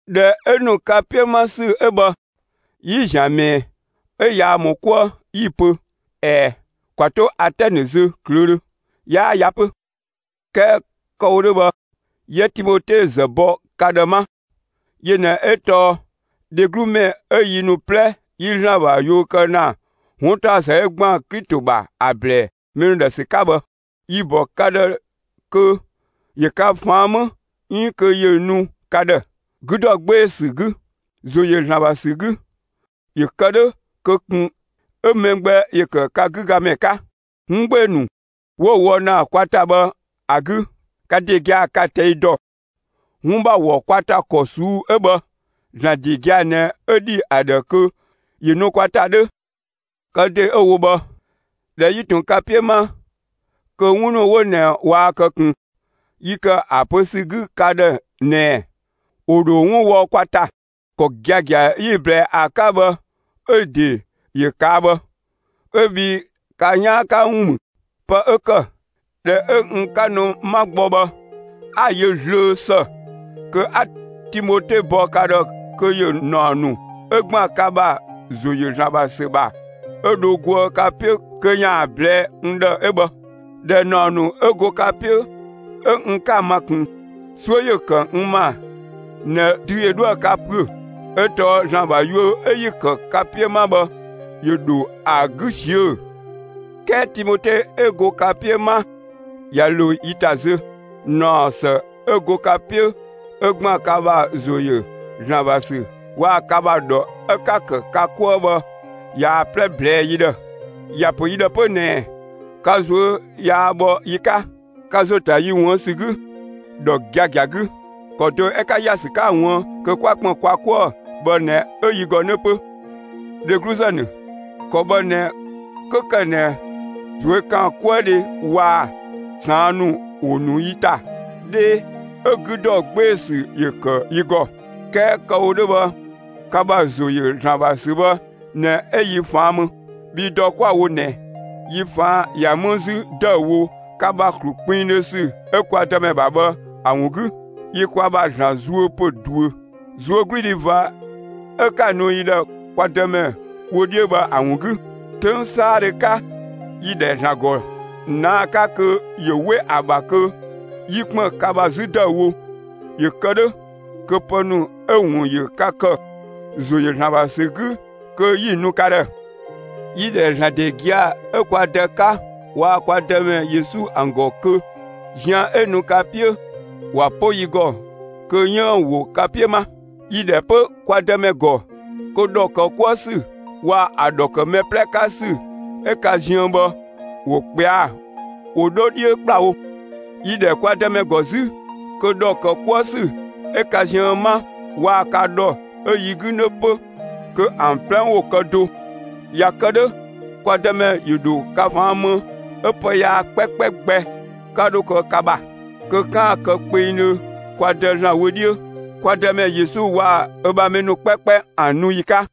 ꞊Dhɛ 'ö ‑nu ka 'piö 'ma ‑sü 'ö bhë, 'yi‑ ‑zian ‑mɛɛ 'ö yaa ‑mɔ 'kuë, 'yi‑ pö: «꞊Ɛɛ, ‑kwa 'to Atɛnë zö ꞊klöödhö, 'yaa ya 'pö.» 'Kɛɛ kë‑ wo 'dhö bhë 'yië Timote ‑zë bɔ ka ‑dhë 'ma. Yö ꞊nɛ 'ö tɔɔ dheglu ‑mɛ 'ö yi ‑nu 'plɛ 'yi ‑Zlan ‑bha yuö kë ‑na 'wuntaɔsë 'ö ‑gban Klito ‑bha ‑a ‑blɛɛ mɛ ‑nu ‑dhë ‑sü 'ka bhë; yi‑ ‑bɔ ka ‑dhë kö ‑yö ka ꞊faan' 'më 'iin kö ‑yö nu ka ‑dhë, 'gü ‑dɔ 'gbee‑ ‑sü 'gü, ‑zo ‑yö ‑Zlan ‑bha ‑sü 'gü, ‑yö kë 'dhö kö ꞊kun 'ö mɛ gbɛ ‑yö ‑kë 'gü ga ‑mɛ 'ka, 'wun 'gbee‑ ‑nu 'wo‑ wɔ ‑na kwa ‑ta bhë ‑a 'gü. Ka ‑de gia‑, 'ka‑ ꞊tɛi' dɔ, 'wun ‑bha ‑wɔ kwa ‑ta ‑kɔ ꞊suu'‑ 'ö bhë ‑Zlan ‑de gia‑ ꞊nɛ 'ö ‑dhi ‑a ‑dhë kö ‑yö nu kwa ‑ta 'dhö. Kë ‑de 'ö‑ wo bhë, ꞊dhɛ 'yi ꞊tun ka 'piö 'ma kö 'wun ‑nu 'wo ꞊nɛ waa kë ꞊kun, yi ‑kë ‑a pö ‑sü 'gü ka ‑dhë ꞊nɛɛ: ‑Wo ‑dho 'wun wɔ kwa ‑ta. ‑Kɔ giagia 'yi‑ ꞊blɛɛ ‑a 'ka bhë 'ö‑ ‑de ‑yö ꞊kaa' bhë; 'ö bhii ka 'yaan 'ka ‑wun ‑mü. Pë 'ö ‑kë, ꞊dhɛ 'ö n 'ka nu 'ma gbɔ bhë 'a‑ yö zlöö ‑së kö 'a Timote bɔ ka ‑dhë kö ‑yö ‑naɔ ‑nu 'ö ‑gban ka ‑bha ‑zo ‑yö ‑Zlan ‑bha ‑sü ‑bha 'ö dho goë ka 'piö kö ‑yaan ꞊blɛɛ'‑ n ‑dhë 'ö bhë. ꞊Dhɛ ‑naɔ ‑nu 'ö go ka 'piö 'ö n 'ka‑ ma ꞊kun, 'suö ‑yö ‑kë n ‑ma ꞊nɛ dü ‑yö 'dhoë‑ ka ‑püö 'ö tɔɔ ‑Zlan ‑bha yuö 'ö 'yi‑ ‑kë ka 'piö 'ma bhë ‑yö ‑dho ‑a 'gü ꞊siö'‑. 'Kɛɛ Timote 'ö go ka 'piö 'ma, ꞊ya ‑lo yi ‑ta zö, ‑naɔsë 'ö go ka 'piö 'ö ‑gban ka ‑bha ‑zo ‑yö ‑Zlan ‑bha ‑sü waa‑ ka ‑bha ‑dhɔ 'ö 'ka‑ ‑kë ka 'kuë‑ bhë ꞊yaa‑ 'plɛ ꞊blɛɛ'‑ yi ‑dhë. ‑Ya ‑pö yi ‑dhë 'pö ꞊nɛ ka ꞊zuö' yaa bhɔ yi 'ka, ka ‑zo ‑ta yi ‑wuën ‑sü 'gü, ‑dhɔ giagia 'gü. ‑Kɔ do 'ö 'ka ‑ya ‑sü 'ka‑ ꞊wuën' kö 'kwa ‑kpën kwa 'kuë bhë ꞊nɛ 'ö yi ‑gɔ 'nö 'pö. Dhegluzë ‑nu, ‑kɔ bhë ꞊nɛ 'kö ‑kë ꞊nɛ ꞊zuökaankuëdhe waa‑ ꞊saan' ‑nu ‑wo ‑nu yi ‑ta 'dhee, 'ö 'gü ‑dɔ 'gbee‑ ‑sü ‑yö ‑kë yi ‑gɔ. 'Kɛɛ kë‑ wo 'dhö bhë ka ‑bha ‑zo ‑yö ‑Zlan ‑bha ‑sü bhë ꞊nɛ 'ö yi ꞊faan' më. Bhii dɔ 'kwa‑ wo ꞊nɛ, yi ꞊faan' ꞊ya 'më 'zü ‑dëüwo ka ‑bha ‑klu kpinngdhö ‑sü 'ö kwa Dëmɛ ‑bha bhë ‑a ‑wun 'gü. Yi kwa ‑bha ‑Zlan zuö ‑pö ꞊duö, ꞊zuögludhi ꞊va 'ö 'ka‑ nu yi ‑dhë kwa Dëmɛ wö 'dhiö bhë ‑a ‑wun 'gü. 'Töng 'saadhö 'ka, yi‑ ‑dhɛ ‑Zlan ‑gɔ ꞊naa'‑ 'ka kö ‑yö 'we ‑a ‑bha kö 'yi ‑kpën ka ‑bha 'zü ‑dëüwo, ‑yö kë 'dhö kö pë ‑nu 'ö‑ ‑wun ‑yö ka ‑kë, ‑zo ‑yö ‑Zlan ‑bha ‑sü 'gü, kö 'yi‑ nu ka ‑dhë. Yi‑ ‑dhɛ ‑Zlan ‑de gia‑ 'ö kwa Dë 'ka waa‑ kwa Dëmɛ Yesu ‑an ‑gɔ kö zian 'ö nu ka 'piö, ‑wa 'po yi ‑gɔ kö 'yiën‑ ‑wo ka 'piö 'ma. Yi‑ ‑dhɛ 'pö kwa Dëmɛ ‑gɔ kö ‑dhɔ ‑kë 'kuë ‑sü waa‑ ‑a ‑dhɔ ‑kë mɛ 'plɛ 'ka ‑sü 'ö ka ziën bhë ‑wo ꞊kpɛa'‑, ‑wo 'dho 'dhiö ‑kplawo. Yi‑ ‑dhɛ kwa Dëmɛ ‑gɔ 'zü kö ‑dhɔ ‑kë 'kuë ‑sü 'ö ka ziën 'ma waa‑ ka ‑dhɔ 'ö yi 'gü 'nö 'pö, kö ‑an 'plɛ ‑wo kë do. ꞊Ya kë 'dhö kwa Dëmɛ ‑yö ‑dho ka ꞊faan' më 'ö pë yaa 'kpɛkpɛ gbɛ 'ka 'dho kë ka ‑bha; kö 'kaan‑ kë kpengdhö kwa Dë ‑Zlan wö 'dhiö, kwa Dëmɛ Yesu waa‑ ö ‑bha mɛ ‑nu 'kpɛkpɛ ‑an nu ‑yi 'ka.